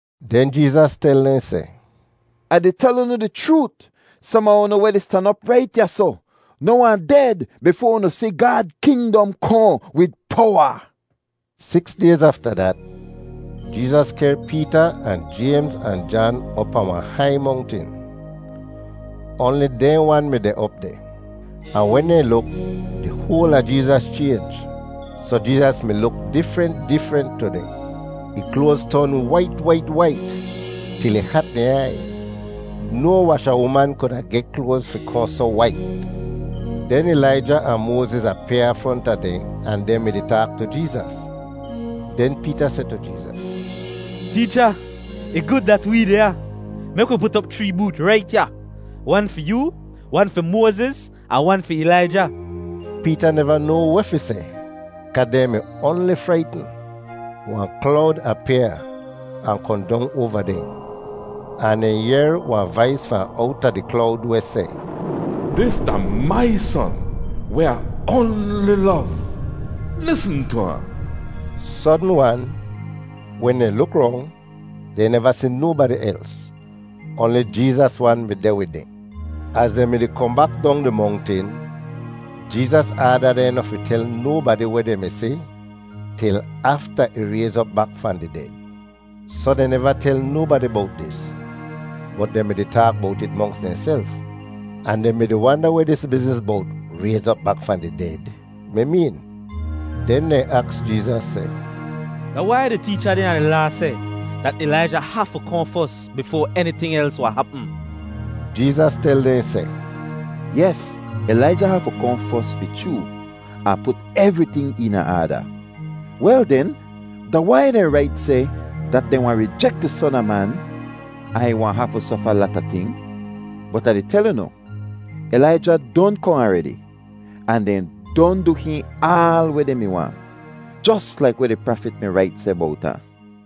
Den Jeezas tel dehn seh, “Ah di tel unu di chroot, som a unu weh di stan op rait ya soh, noh wahn ded bifoa unu si Gaad kingdom kohn wid powa!” Siks dayz afta dat, Jeezas kehr Peeta ahn Jaymz ahn Jan op pahn wahn hai mongtin. Oanli dehn wan mi deh op deh. Ahn wen dehn luk, di hoal a Jeezas chaynj soh Jeezas mi luk difrent difrent tu dehn. Ih kloaz ton wait wait wait til ih hat dehn aiy. No washa uman kuda geh kloaz fi kohn soh wait! Den Ilaija ahn Moaziz apyaa fronta dehn ahn dehn mi-di taak tu Jeezas! Den Peeta seh tu Jeezas, “Teecha, ih gud dat wee deh ya. Mek wi put op chree boot rait ya, wan fi yoo, wan fi Moaziz, ahn wan fi Ilaija.” Peeta neva noa weh fi seh kaa dehn mi oanli fraitn. Wahn klowd apyaa ahn kohn dong oava dehn, ahn dehn yehr wahn vais fahn owta di klowd weh seh, “Dis da mai Son weh Ah oanli lov. Lisn tu ahn.” Sodn-wan, wen dehn luk rong, dehn neva si nobadi els; oanli Jeezas wan mi deh wid dehn. Az dehn mi-di kohn bak dong di mongtin, Jeezas aada dehn noh fi tel nobadi weh dehn mi si til afta ih rayz op bak fahn di ded. Soh dehn neva tel nobadi bowt dis, bot dehn mi-di taak bowt it monks dehnself, ahn dehn mi-di wanda weh dis bizniz bowt “rayz op bak fahn di ded” mi meen. Den dehn aks Jeezas seh, “Da wai di teecha dehn a di Laa seh dat Ilaija hafu kohn fos bifoa eniting els wahn hapm?” Jeezas tel dehn seh, “Yes. Ilaija hafu kohn fos fi chroo, ahn put evriting eena aada. Wel den, da wai dehn rait seh dat dehn wahn rijek di Son a Man ahn ih wahn hafu sofa lata ting? Bot Ah di tel unu, Ilaija don kohn aredi ahn dehn don du hihn aal weh dehn mi waahn, jos laik weh di prafit mi rait seh bowt ahn.”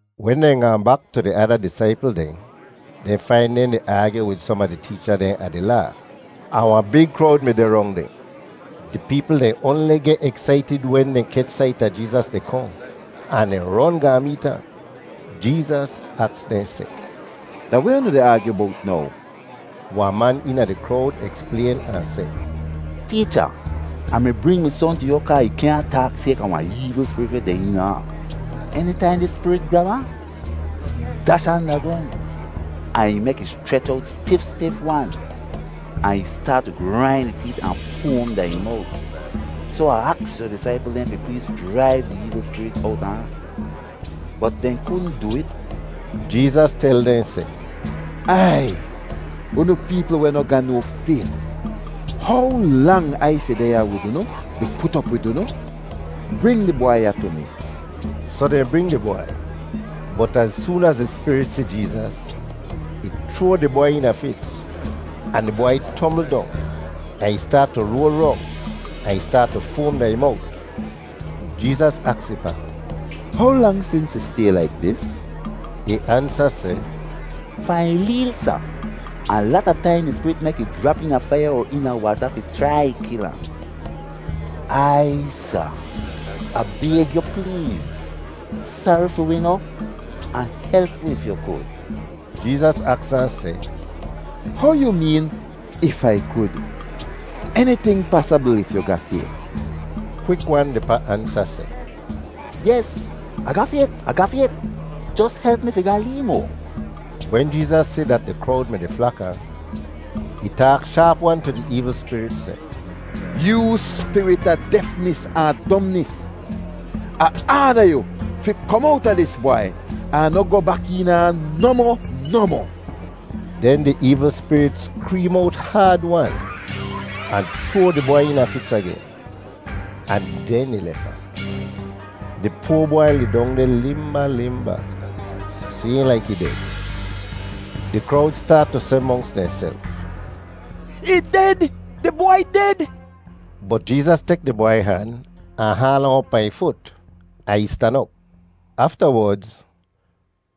Wen dehn gaahn bak tu di ada disaipl dehn, dehn fain dehn di aagyu wid som a di teecha dehn a di Laa, ahn wahn big krowd mi deh rong dehn. Di peepl dehn oanli geh eksaitid wen dehn kech sait a Jeezas di kohn, ahn dehn ron gaahn meet ahn. Jeezas aks dehn seh, “Da weh unu di aagyu bowt now?” Wahn man eena di krowd eksplayn ahn seh, “Teecha, Ah mi bring mi son tu yu kaa ih kyaahn taak sayka wahn eevl spirit weh deh eena ahn. Enitaihn dis spirit grab ahn, ih dash ahn da grong, ahn ih mek ih schrech owt stif stif-wan, ahn ih staat tu grain ih teet ahn foam da ih mowt. Soh Ah aks yu disaipl dehn fi pleez jraiv di eevl spirit owta ahn, bot dehn kudn du it.” Jeezas tel dehn seh, “Aiy, unu peepl weh noh ga no fayt! How lang Ai fi deh ya wid unu, di put op wid unu? Bring di bwai ya tu mi.” Soh dehn bring di bwai, bot az soon az di spirit si Jeezas, ih chroa di bwai eena fits, ahn di bwai tombl dong ahn ih staat tu roal rong ahn ih staat tu foam da ih mowt. Jeezas aks ih pa, “How lang sins ih stay laik dis?” Ih ansa seh, “Fahn ih leel, Sa. Ahn lata taim di spirit mek ih jrap eena faiya er eena waata fi chrai kil ahn. Aiy, sa! Ah bayg yu pleez, sari fi wi noh, ahn help wi if yu kud.” Jeezas aks ahn seh, “How yu meen ‘if Ai kud’? Eniting pasabl if yu ga fayt.” Kwik-wan di pa ansa seh, “Yes, Ah ga fayt, Ah ga fayt. Jos help mi fi ga lee moa!” Wen Jeezas si dat di krowd mi-di flak ahn, ih taak shaap-wan tu di eevl spirit seh, “Yoo spirit a defnis ahn domnis, Ah aada yu fi kom owta dis bwai ahn noh goh bak eena ahn nohmoh nohmoh!” Den di eevl spirit skreem owt haad-wan ahn chroa di bwai eena fits agen, ahn den ih lef ahn. Di poa bwai lidong deh limba limba, sayhn laik ih ded. Di krowd staat tu seh monks dehnself, “Ih ded, di bwai ded!” Bot Jeezas tek di bwai han ahn haal ahn op pahn ih fut ahn ih stan op. Aftawodz,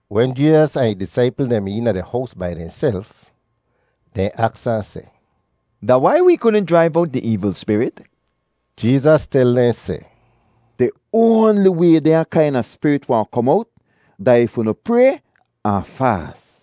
wen Jeezas ahn ih disaipl dehn mi eena di hows bai dehnself, dehn aks ahn seh, “Da wai wee kudn jraiv owt di eevl spirit?” Jeezas tel dehn seh, “Di oanli way dehnya kaina spirit wahn kom owt, da if unu pray [ahn faas].”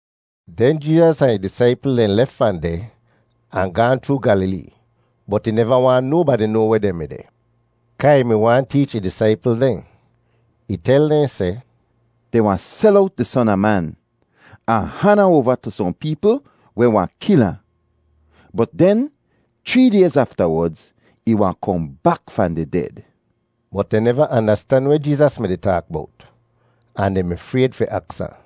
Den Jeezas ahn ih disaipl dehn lef fahn deh ahn gaahn chroo Gyalilee bot ih neva waahn nobadi noa weh dehn mi deh, kaa ih mi waahn teech ih disaipl dehn. Ih tel dehn seh, “Dehn wahn sel owt di Son a Man, ahn han ahn oava tu sohn peepl weh wahn kil ahn. Bot den chree dayz aftawodz, ih wahn kohn bak fahn di ded.” Bot dehn neva andastan weh Jeezas mi-di taak bowt, ahn dehn mi frayd fi aks ahn.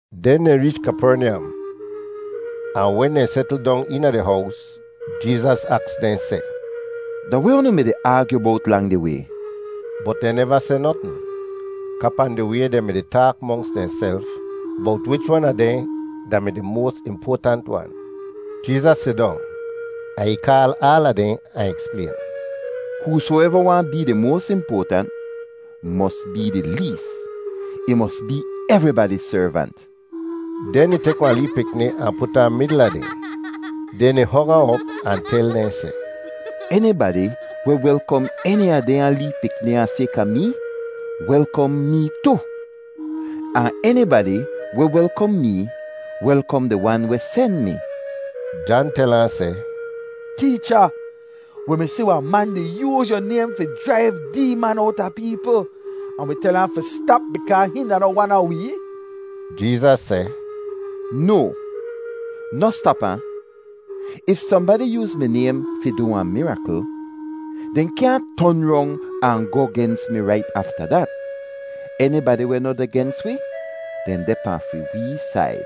Den dehn reech Kapernyam, ahn wen dehn setl dong eena di hows, Jeezas aks dehn seh, “Da weh unu mi-di aagyu bowt lang di way?” Bot dehn neva seh notn kaa pahn di way dehn mi-di taak monks dehnself bowt wich wan a dehn da-mi di moas impoatant wan. Jeezas sidong, ahn ih kaal aala dehn ahn eksplayn, “Husoeva waahn bee moas impoatant mos bee di lees; ih mos bee evribadi servant!” Den ih tek wahn lee pikni ahn put ahn midl a dehn, den ih hog ahn op ahn tel dehn seh, “Enibadi weh welkom eni a dehnya lee pikni ya sayka mee welkom mee tu; ahn enibadi weh welkom mee welkom di Wan weh sen mi!” Jan tel ahn seh, “Teecha, wi mi si wahn man di yooz yu naym fi jraiv deeman owta peepl, ahn wi tel ahn fi stap bikaa hihn da noh wan a wee.” Jeezas seh, “No! Noh stap ahn! If sohnbadi yooz mi naym fi du wahn mirakl, dehn kyaahn ton rong ahn goh gens mi rait afta dat. Enibadi weh noh deh gens wi, dehn deh pahn fi wee said.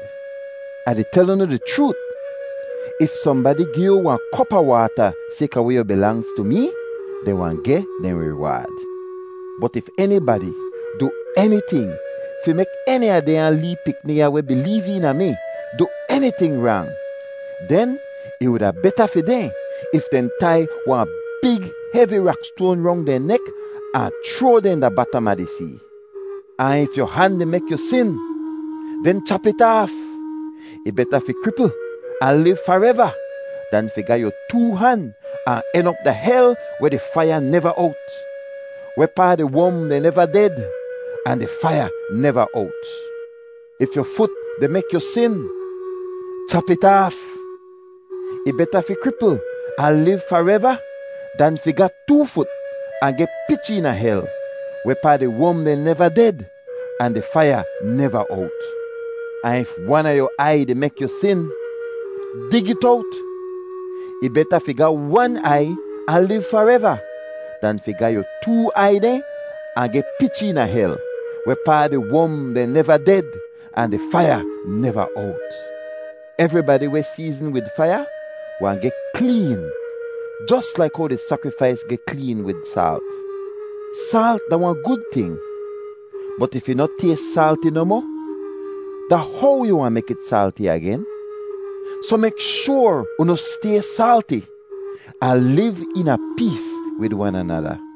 Ah di tel unu di chroot, if sohnbadi gi yu wahn kop a waata sayka weh yu bilangz tu mee, dehn wahn geh dehn riwaad. “Bot if enibadi du eniting fi mek eni a dehnya lee pikni ya weh bileev eena mi du eniting rang, den ih wuda beta fi dehn if dehn tai wahn big hevi rakstoan rong dehn nek ahn chroa dehn da batam a di see. Ahn if yu han di mek yu sin, den chap it aaf. Ih beta fi kripl ahn liv fareva dan fi ga yu too han ahn en op da hel weh di faiya neva owt. [Wehpaa di wom dehn neva ded, ahn di faiya neva owt.] “If yu fut di mek yu sin, chap it aaf. Ih beta fi kripl ahn liv fareva dan fi ga too fut ahn geh pich eena hel. [Wehpaa di wom dehn neva ded, ahn di faiya neva owt.] Ahn if wan a yu aiy di mek yu sin, dig it owt; ih beta fi ga wan aiy ahn liv fareva dan fi ga yu too aiy dehn ahn geh pich eena hel, wehpaa ‘di wom dehn neva ded, ahn di faiya neva owt.’ “Evribadi weh seezn wid faiya wahn geh kleen jos laik how di sakrifais geh kleen wid saalt. “Saalt da wahn gud ting, bot if ih noh tays saalti nohmoh, da how yu wahn mek it saalti agen? Soh mek shoar unu stay saalti, ahn liv eena pees wid wan anada.”